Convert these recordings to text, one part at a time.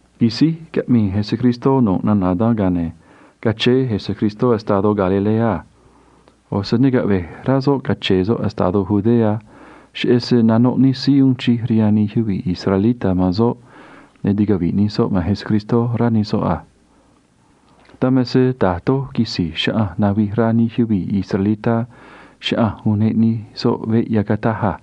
Quisíj caꞌmii Jesús nu̱ꞌ nana̱ dan, ga̱a ne̱ cachéé Jesús estadó Galilea a. ꞌO̱ se ne caꞌve̱j rá soꞌ cache̱e̱ soꞌ estadó Judea, cheꞌé se nanoꞌ nij síí uun chij rihaan nij yuvii̱ israelitá man soꞌ, ne̱ ticavi̱ꞌ nij soꞌ man Jesús, rá nij soꞌ a. Dan me se da̱j doj quisi̱j chaꞌanj navij rá nij yuvii̱ israelitá chaꞌanj uneꞌ nij soꞌ veꞌ yacataj a.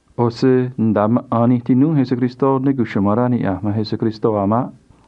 ꞌO̱ se nda̱a maꞌa̱n nij tinúú Jesús ne cuchuma̱n rá niꞌya̱j man Jesús a̱ maꞌ.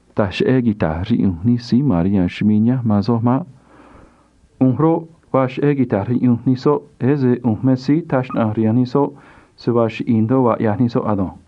Taj cheꞌé quita̱j riꞌyunj nij síí ma̱n rihaan chumii̱ nihánj man soj maꞌ. ꞌU̱nj roꞌ, vaa cheꞌé quita̱j riꞌyunj nij soꞌ, ese ꞌu̱nj me síí taj xnaꞌanj rihaan nij soꞌ se vaa chiꞌi̱i̱ ndoꞌo vaa ꞌyaj nij soꞌ ado̱nj.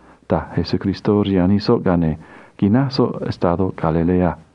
―taj Jesús rihaan nij soꞌ a. Ga̱a ne̱ quináj soꞌ estadó Galilea a.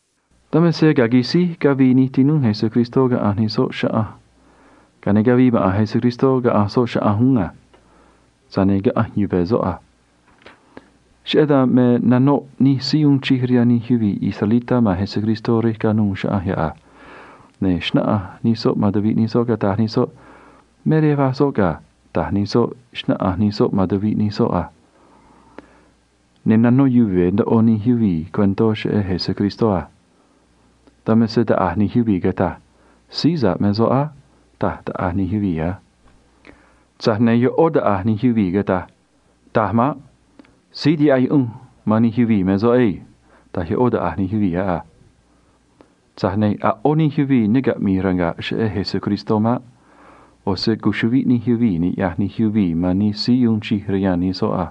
Dan me se ga̱a quisíj cavii nij tinúú Jesús caꞌanj nij soꞌ chaꞌanj, ga̱a ne̱ cavii maꞌa̱n Jesús caꞌanj soꞌ chaꞌanj uún a. Tza̱j ne̱ caꞌanj yuve̱ soꞌ a. Cheꞌé dan me nanoꞌ nij síí uun chij rihaan nij yuvii̱ israelitá man Jesús rej canuû chaꞌanj yoꞌ a. Ne̱ xnáꞌanj nij soꞌ man tuviꞌ nij soꞌ, cataj nij soꞌ a: ―Me rej va̱j síí yoꞌ ga̱ ―taj nij soꞌ, xnáꞌanj nij soꞌ man tuviꞌ nij soꞌ a. Ne̱ ri̱i̱ ndoꞌo yuvii̱ man chaꞌanj ne̱ nanó yuve̱ ndoꞌo nij yuvii̱ cuentó cheꞌé Jesús a. Dan me se taꞌa̱j nij yuvii̱ cataj a: ―Síí sa̱ꞌ me soꞌ á ―taj taꞌa̱j nij yuvii̱ a. Tza̱j ne̱ ꞌó taꞌa̱j nij yuvii̱ cataj a: ―Taj maꞌ. Síí tihaꞌ yuꞌunj man nij yuvii̱ me soꞌ na̱nj ado̱nj ―taj ꞌó taꞌa̱j nij yuvii̱ yoꞌ a. Tza̱j ne̱ a̱ ꞌó nij yuvii̱ ne caꞌmi̱i̱ ranga̱ꞌ cheꞌé Jesús maꞌ. ꞌO̱ se cuchuꞌviꞌ nij yuvii̱ niꞌya̱j nij yuvii̱ man nij síí uun chij rihaan nij soꞌ a.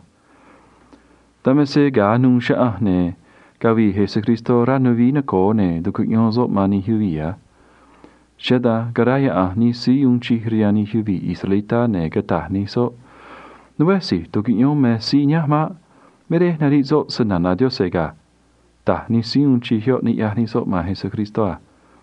Dan me se a̱j quisíj caꞌa̱nj güii anuû chaꞌanj, ne̱ cavii Jesús rej ya̱nj nuvií noco̱o, ne̱ tucuꞌyón soꞌ man nij yuvii̱ a. Cheꞌé dan caráyaꞌa̱nj nij síí uun chij rihaan nij yuvii̱ israelitá, ne̱ cataj nij soꞌ a: ―Né si̱j tucuꞌyón me síí nihánj maꞌ. Me rej nariꞌ soꞌ snana̱ Yaꞌanj ga̱ ―taj nij síí uun chij yoꞌ niꞌya̱j nij soꞌ man Jesús a.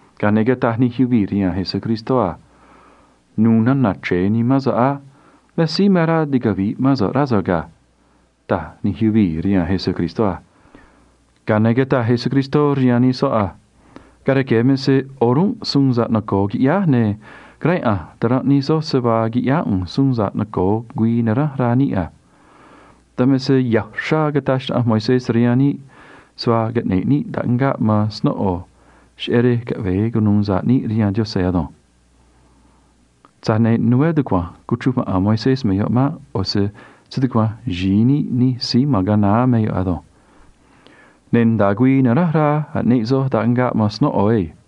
Ga̱a ne̱ cataj nij yuvii̱ rihaan Jesús a: ―Nu̱u̱ nana̱ chre̱e nimán so̱ꞌ á. Me síí me rá ticavi̱ꞌ mán so̱ꞌ, rá so̱ꞌ ga̱ ―taj nij yuvii̱ rihaan Jesús a. Ga̱a ne̱ cataj Jesús rihaan nij soꞌ a: ―Ga̱a rque̱ me se o̱rúnꞌ suun sa̱ꞌ noco̱o quiꞌyáj, ne̱ caráyaꞌa̱nj ta̱ranꞌ nij soj se vaa quiꞌyáá ꞌu̱nj suun sa̱ꞌ noco̱o güii naránj rá níꞌ a. Dan me se ya̱ uxrá cataj xnaꞌanj Moisés rihaan níꞌ se vaa caꞌne̱ꞌ níꞌ taꞌngaꞌ man snóꞌo cheꞌé rej caꞌve̱e cunu̱u sa̱ꞌ níꞌ rihaan Yaꞌanj ado̱nj. Tza̱j ne̱ né tucua̱nj cuchruj maꞌa̱n Moisés me yoꞌ maꞌ. ꞌO̱ se stucua̱nj xi̱i níꞌ nij síí ma̱n ga̱a naá me yoꞌ ado̱nj. Ne̱ nda̱a güii naránj rá aꞌneꞌ soj taꞌngaꞌ man snóꞌo ado̱nj.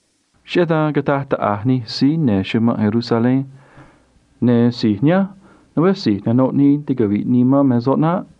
Cheꞌé dan cataj taꞌa̱j nij síí ya̱nj chumanꞌ Jerusalén a: ―Ne̱ si̱j nihánj roꞌ, né si̱j nanoꞌ nii ticavi̱ꞌ nii man me soꞌ naꞌ.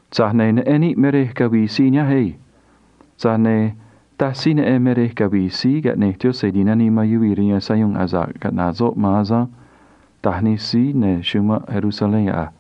Tza̱j ne̱ neꞌen níꞌ me rej cavii síí nihánj ado̱nj. Tza̱j ne̱ taj síí neꞌen me rej cavi̱i̱ Síí Caꞌne̱j Yaꞌanj Ti̱nanii man Yuvii̱ rihaan Sayuun asa̱ꞌ caꞌnaꞌ soꞌ a̱ maꞌ ―taj nij síí ma̱n chumanꞌ Jerusalén yoꞌ a.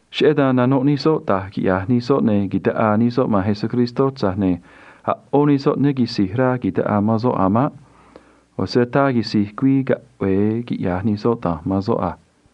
Cheꞌé dan nanoꞌ nij soꞌ da̱j quiꞌya̱j nij soꞌ ne̱ ta̱ꞌaa nij soꞌ man Jesús, tza̱j ne̱ a̱ ꞌó nij soꞌ ne ta̱ꞌaa man soꞌ a̱ maꞌ. ꞌO̱ se ataa quisi̱j güii caꞌve̱e quiꞌya̱j nij soꞌ da̱nj man soꞌ a.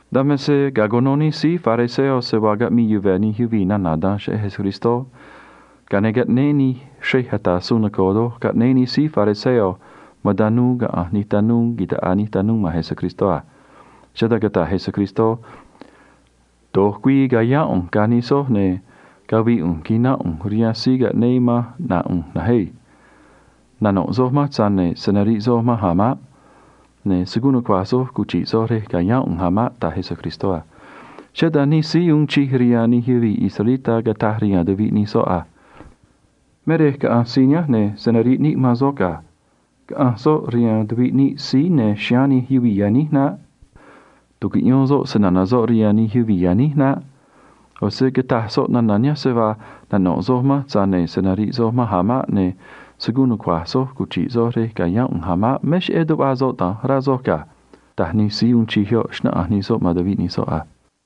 Dan me se ga̱a cuno nij síí fariseo se vaa caꞌmii yuve̱ nij yuvii̱ nana̱ dan cheꞌé Jesús, ga̱a ne̱ caꞌnéé nij xrej ata̱ suun noco̱o caꞌnéé nij síí fariseo man tanuu tumé nuvií noco̱o caꞌa̱nj nij tanuu ta̱ꞌaa nij tanuu man Jesús a. Cheꞌé dan cataj Jesús a: ―Do̱j güii ca̱yáán ꞌu̱nj ga̱ nij soj, ne̱ cavi̱i̱ ꞌu̱nj quina̱nꞌ ꞌu̱nj rihaan síí caꞌnéé manj caꞌna̱ꞌ ꞌu̱nj na̱nj ado̱nj. Nano̱ꞌ soj manj, tza̱j ne̱ se̱ nariꞌ soj manj a̱ maꞌ. Ne̱ se̱ guun nucua̱j soj cuchi̱ꞌ soj rej ca̱yáán ꞌu̱nj a̱ maꞌ ―taj Jesús a. Cheꞌé dan nij síí uun chij rihaan nij yuvii̱ israelitá cataj rihaan tuviꞌ nij soꞌ a: ―Me rej caꞌa̱nj síí nihánj, ne̱ se̱ nariꞌ níꞌ man soꞌ ga̱. Caꞌa̱nj soꞌ rihaan tuviꞌ níꞌ síí ya̱nj chiháán nij síí aꞌmii xnaꞌánj griego naꞌ. Tu̱cuꞌyón soꞌ snana̱ soꞌ rihaan nij síí aꞌmii xnaꞌánj griego naꞌ. ꞌO̱ se cataj soꞌ nana̱ nihánj a: “Nano̱ꞌ soj manj, tza̱j ne̱ se̱ nariꞌ soj manj a̱ maꞌ. Ne̱ se̱ guun nucua̱j soj cuchi̱ꞌ soj rej ca̱yáán ꞌu̱nj a̱ maꞌ.” Me cheꞌé tuꞌva soꞌ da̱nj, rá soj ga̱ ―taj nij síí uun chij yoꞌ, xnáꞌanj nij soꞌ man tuviꞌ nij soꞌ a.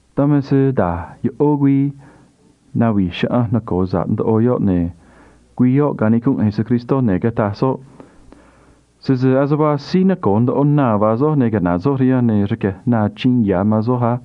Dan me se ga̱a güii navi̱j chaꞌanj, güii noco̱o doj, ne̱ canicunꞌ Jesús, ne̱ cataj soꞌ a: ―Sese ase vaa síí nacoo̱ ndoꞌo na vaa soj, ne̱ caꞌna̱ꞌ soj rihanj, ne̱ rque̱j na achiin ya̱ man soj á.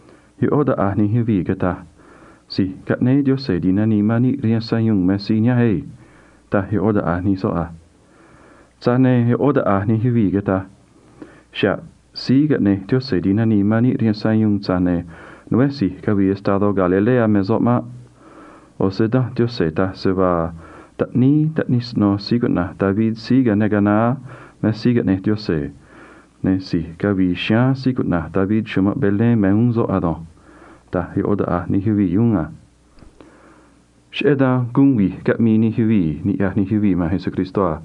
ꞌÓ taꞌa̱j nij yuvii̱ cataj a: ―Si̱j Caꞌnéé Yaꞌanj Ti̱nanii man Yuvii̱ rihaan Sayuun me síí nihánj chugua̱nj ―taj ꞌó taꞌa̱j nij soꞌ a. Tza̱j ne̱ ꞌó taꞌa̱j nij yuvii̱ cataj a: ―Xa̱ꞌ Síí Caꞌne̱j Yaꞌanj Ti̱nanii man Yuvii̱ rihaan Sayuun, tza̱j ne̱ né si̱j cavii estadó Galilea me soꞌ maꞌ. ꞌO̱ se Danj Yaꞌanj taj se vaa taꞌníí taꞌnij siꞌno̱ rey cuꞌna̱j David síí cayáán ga̱a naá me Síí Caꞌne̱j Yaꞌanj Ti̱nanii man Yuvii̱ rihaan Sayuun, ne̱ si̱j cavi̱i̱ chiháán David chumanꞌ Belén me uún soꞌ ado̱nj ―taj ꞌó taꞌa̱j nij yuvii̱ uún a. Cheꞌé dan guun vi̱j caꞌmii nij yuvii̱, niꞌya̱j nij yuvii̱ man Jesús a.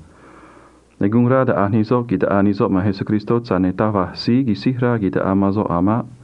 Ne̱ guun rá taꞌa̱j nij soꞌ ta̱ꞌaa nij soꞌ man Jesús, tza̱j ne̱ taj va̱j síí taꞌaa man soꞌ a̱ maꞌ.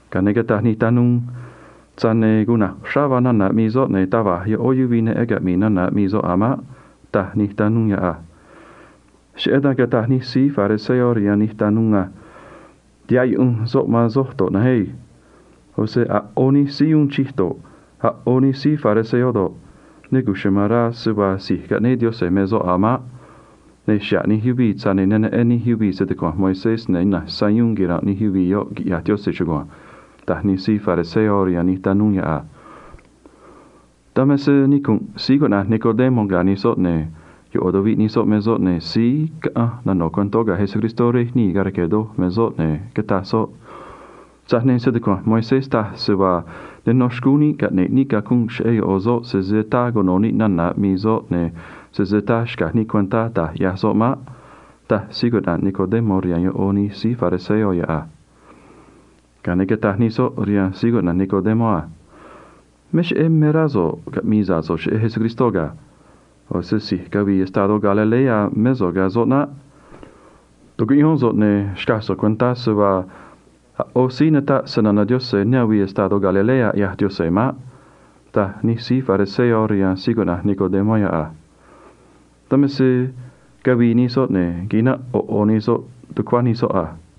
Ga̱a ne̱ cataj nij tanuu a: ―Cuna̱j uxrá vaa nana̱ aꞌmii soꞌ, ne̱ taj va̱j ꞌó yuvii̱ neꞌen caꞌmi̱i̱ nana̱ aꞌmii soꞌ a̱ maꞌ ―taj nij tanuu yoꞌ a. Cheꞌé dan cataj nij síí fariseo rihaan nij tanuu a: ―Tihaꞌ yuꞌunj soꞌ man soj uún a̱ naꞌ. ꞌO̱ se a̱ ꞌó nij síí uun chij rihaan níꞌ si̱j israelitá do̱ꞌ, a̱ ꞌó nij síí fariseo do̱ꞌ, ne cuchuma̱n rá se vaa si̱j caꞌnéé Yaꞌanj me soꞌ a̱ maꞌ. Ne̱ xa̱ꞌ nij yuvii̱, tza̱j ne̱ ne neꞌen nij yuvii̱ stucua̱nj Moisés, ne̱ ina̱nj sayuun quira̱nꞌ nij yuvii̱ yoꞌ, quiꞌya̱j Yaꞌanj chugua̱nj ―taj nij síí fariseo rihaan nij tanuu yoꞌ a. Dan me se nicu̱nꞌ síí cuꞌna̱j Nicodemo ga̱ nij soꞌ, ne̱ ꞌo̱ tuviꞌ nij soꞌ me soꞌ, ne̱ síí caꞌanj caꞌmi̱i̱ ga̱ Jesús ga̱a rque̱ doj me soꞌ, ne̱ cataj soꞌ a: ―Tza̱j ne̱ stucua̱nj Moisés taj se vaa ne nó xcúún níꞌ caꞌne̱ꞌ níꞌ cacunꞌ cheꞌé ꞌo̱ soꞌ, sese ataa cuno̱ níꞌ nana̱ aꞌmii soꞌ ne̱ sese ataa xca̱j níꞌ cuentá da̱j ꞌyaj soꞌ maꞌ ―taj Nicodemo rihaan ꞌó nij síí fariseo yoꞌ a. Ga̱a ne̱ cataj nij soꞌ rihaan Nicodemo a: ―Me cheꞌé me rá so̱ꞌ caꞌmi̱i̱ sa̱ꞌ so̱ꞌ cheꞌé Jesús ga̱. ꞌO̱ se si̱j cavii estadó Galilea mé so̱ꞌ ga̱ soꞌ naꞌ. Tu̱cuꞌyón so̱ꞌ, ne̱ xca̱j so̱ꞌ cuentá se vaa a̱ ꞌó síí nataꞌ snana̱ Yaꞌanj ne avii estadó Galilea, ꞌyaj Yaꞌanj maꞌ ―taj nij síí fariseo rihaan Nicodemo yoꞌ a. Dan me se cavii nij soꞌ, ne̱ quinanꞌ ꞌo̱ ꞌo̱ nij soꞌ tucuá nij soꞌ a.